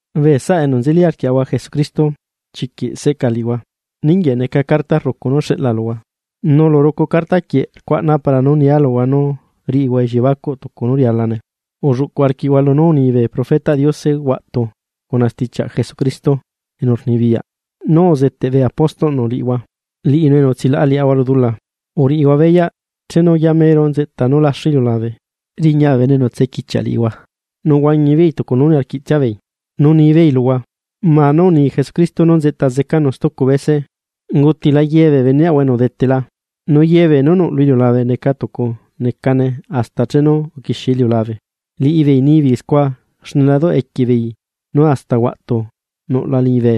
Bee saꞌa enu nzeli arquiaꞌahua Jesucristo chiquiꞌ seꞌca liꞌihua, ninguieꞌ neca carta rrucu nú xeꞌla luhua. Nu lu rucu carta quieꞌ rcuaꞌna para nu nia luhua nú riꞌihua elliebacuꞌ tucu nú rialane. Ulluꞌcuꞌ arquiꞌhua lunú uni bee profetaꞌ Diose huaꞌtu cuna stichiaꞌ Jesucristo enu rnibiyaꞌ nú uzeteꞌ bee apóstolꞌnu liꞌihua, liꞌinu enu utsilaꞌa liaꞌahua lu dula. Uriꞌihua beyaꞌ chenu yamero nzeꞌta nú laxu iliulabe, chuꞌu bee bene enu tsequichiaꞌ liꞌihua, nu huañi beei tucu nu niarquiꞌ tsiabeei, nu nibeei luhua: “¿Ma nu unii Cristo nú nzeꞌta zecanu stucu bese? Ungutila ye bee beneaꞌahua enu udetela, nu ye beenú nuꞌ lu iliulabe neca tucu necane hasta chenu uquixie iliulabe.” Liꞌibeei nibeei scua xne la duꞌ equie beei nú hasta huaꞌtu nuꞌla liñibe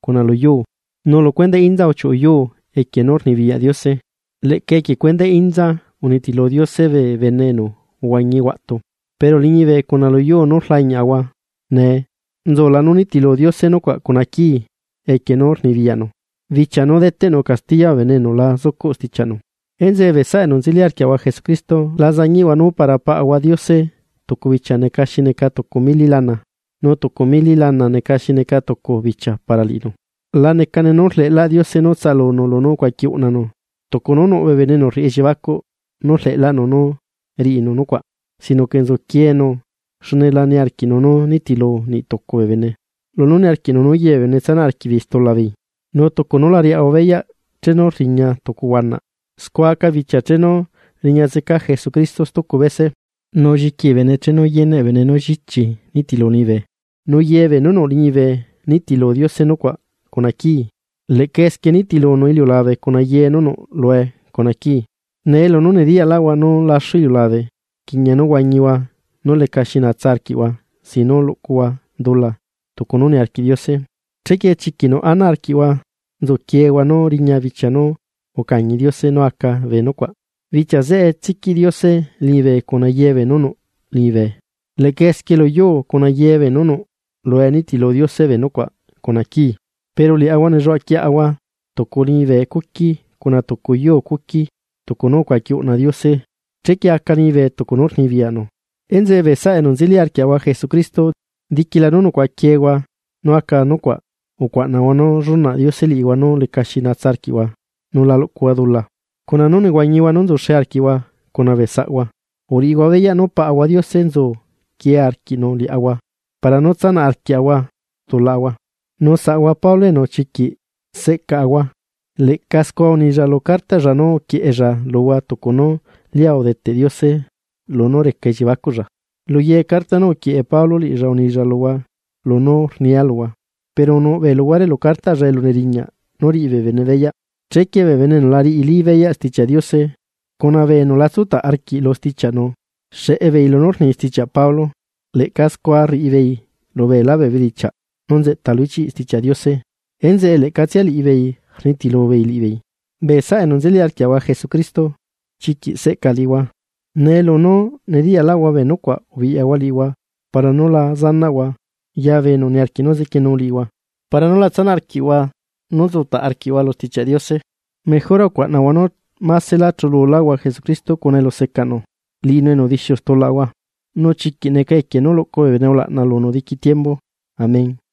cuna lu yuu, nu lu cuendaꞌ inza ungacheꞌ yuu cuna poderꞌ Diose. Leꞌca equie cuendaꞌ inza unitilu Diose bee bene enu uhuañi huaꞌtu. Pero liñibe cuna lu yuu nú rlañiaꞌahua nee, nzula nú nitilu Diose nucuaꞌ cuna quii equie nú rnibiyaꞌnu, bichia nú deteꞌnu castiya bee bene enu la zucuꞌ stichiaꞌnu. Enzeꞌe bee saꞌa enu nzeli arquiaꞌahua Jesucristo, la zañiꞌhua nú para Paꞌahua Diose tucu bichia neca xi neca tucu mili lana, nu tucu mili lana neca xi neca tucu bichia para liꞌinu. La necane nu rleꞌlaꞌ Diose nu tsaꞌalunu lunú ucuaqui uꞌnanu tucu nú nuꞌ bee bene enu rriꞌi elliebacuꞌ nú rleꞌlaꞌnu nú riꞌinu nucuaꞌ sino que nzuquienu. Xne la niarquiꞌnu nú nitilu niꞌtucu bee bene, lunú niarquiꞌnu nú ye bee bene tsanaꞌ arquiꞌbeei stula beei. Nu tucu nu la riaꞌahua beyaꞌ chenu rriña tucu huanaꞌ. Scua aca bichia chenu riña zeca Jesucristo stucu bese, nu lliqui bee bene chenu yeneꞌ bee bene nú llichi nitilu liñibe, nu ye beenú nuꞌ liñibe nitilu Diose nucuaꞌ cuna quii, leꞌca esquie nitilunu iliulabe cuna ye nú nuꞌ lue cuna quii. Nee lunú nediyaꞌlaꞌhua nú laxu iliulabe, rquiꞌña nú huañihua nu lecaxi natsa arquiꞌhua sin nu luꞌcuhua dula tucu nu niarquiꞌ Diose. Chequie chiquiꞌ nuꞌ ana arquiꞌhua nzuquiehua nú riña bichia nu ucañi Diose nú aca bee nucuaꞌ, bichia zeꞌe tsiquiꞌ Diose liñibe cuna ye beenú nuꞌ liñibe. Leꞌca esquie lu yuu cuna ye nú nuꞌlue nitilu Diose bee nucuaꞌ, cuna quii. Pero liaꞌahua nelluaꞌa quiaꞌahua tucu liñibe cuqui cuna tucu yuu cuqui, tucu nú ucuaqui uꞌna Diose, tucu elusticia nú neli neca liñibe. Enzeꞌe bee saꞌa enu nzeli arquiaꞌahua Jesucristo, diquila nú nucuaꞌaquiehua nu aca nucuaꞌ, ucuaꞌnahua nú llunaꞌ Diose liꞌihua nú lecaxi nahua nu la luꞌcuhua dula, cuna nú nehuañihua nu nzuxe arquiꞌhua cuna bee saꞌhua. Uriꞌihua beyaꞌ nú Paꞌahua Diose nzu quie arquiꞌnu liaꞌahua para nú tsanaꞌ arquiaꞌahua stulaꞌahua. Nu saꞌahua Pablo enu chiquiꞌ seꞌcaꞌahua, leꞌca scua unilla lu cartaꞌlla nú uquieꞌella luhua tucu nú lia udeteꞌ Diose lunú reca elliebacuꞌlla. Lu ye carta nú uquieꞌe Pablo liꞌilla unilla luhua lunú rnia luhua. Pero nuꞌbee luhuare lu cartaꞌlla elu neriñaꞌ nú riꞌi bee bene beyaꞌ, chequie bee bene enu la riꞌili beyaꞌ Stichiaꞌ Diose cuna bee enu la tsutaꞌ arquiꞌ lu stichiaꞌnu xeꞌe beei lunú rni stichiaꞌ Pablo, leꞌca scua rriꞌi beei lu beelá bee bedichiaꞌ nú nzeꞌta lu ichiꞌ Stichiaꞌ Diose, enzeꞌe leꞌcatsia liꞌibeei rnitilu beei liꞌibeei. Bee saꞌa enu nzeli arquiaꞌahua Jesucristo, chiquiꞌ seꞌca liꞌihua, nee lunú nediyaꞌlaꞌhua bee nucuaꞌ ubiꞌyahua liꞌihua para nú la zanaꞌhua letaya bee enu niarquiꞌ nú zequienu liꞌihua para nú tsanaꞌ arquiꞌhua lunú nzutaꞌ arquiꞌhua lu Stichiaꞌ Diose. Mejora ucuaꞌnahua nú másela chululáhua Jesucristo cuna elusecaꞌnu, liꞌinu enu udixiu stulaꞌahua. ¡Nu chiquiꞌ neca equie nú luꞌcu bee bene ulaꞌna lunu diqui tiembu! Amén.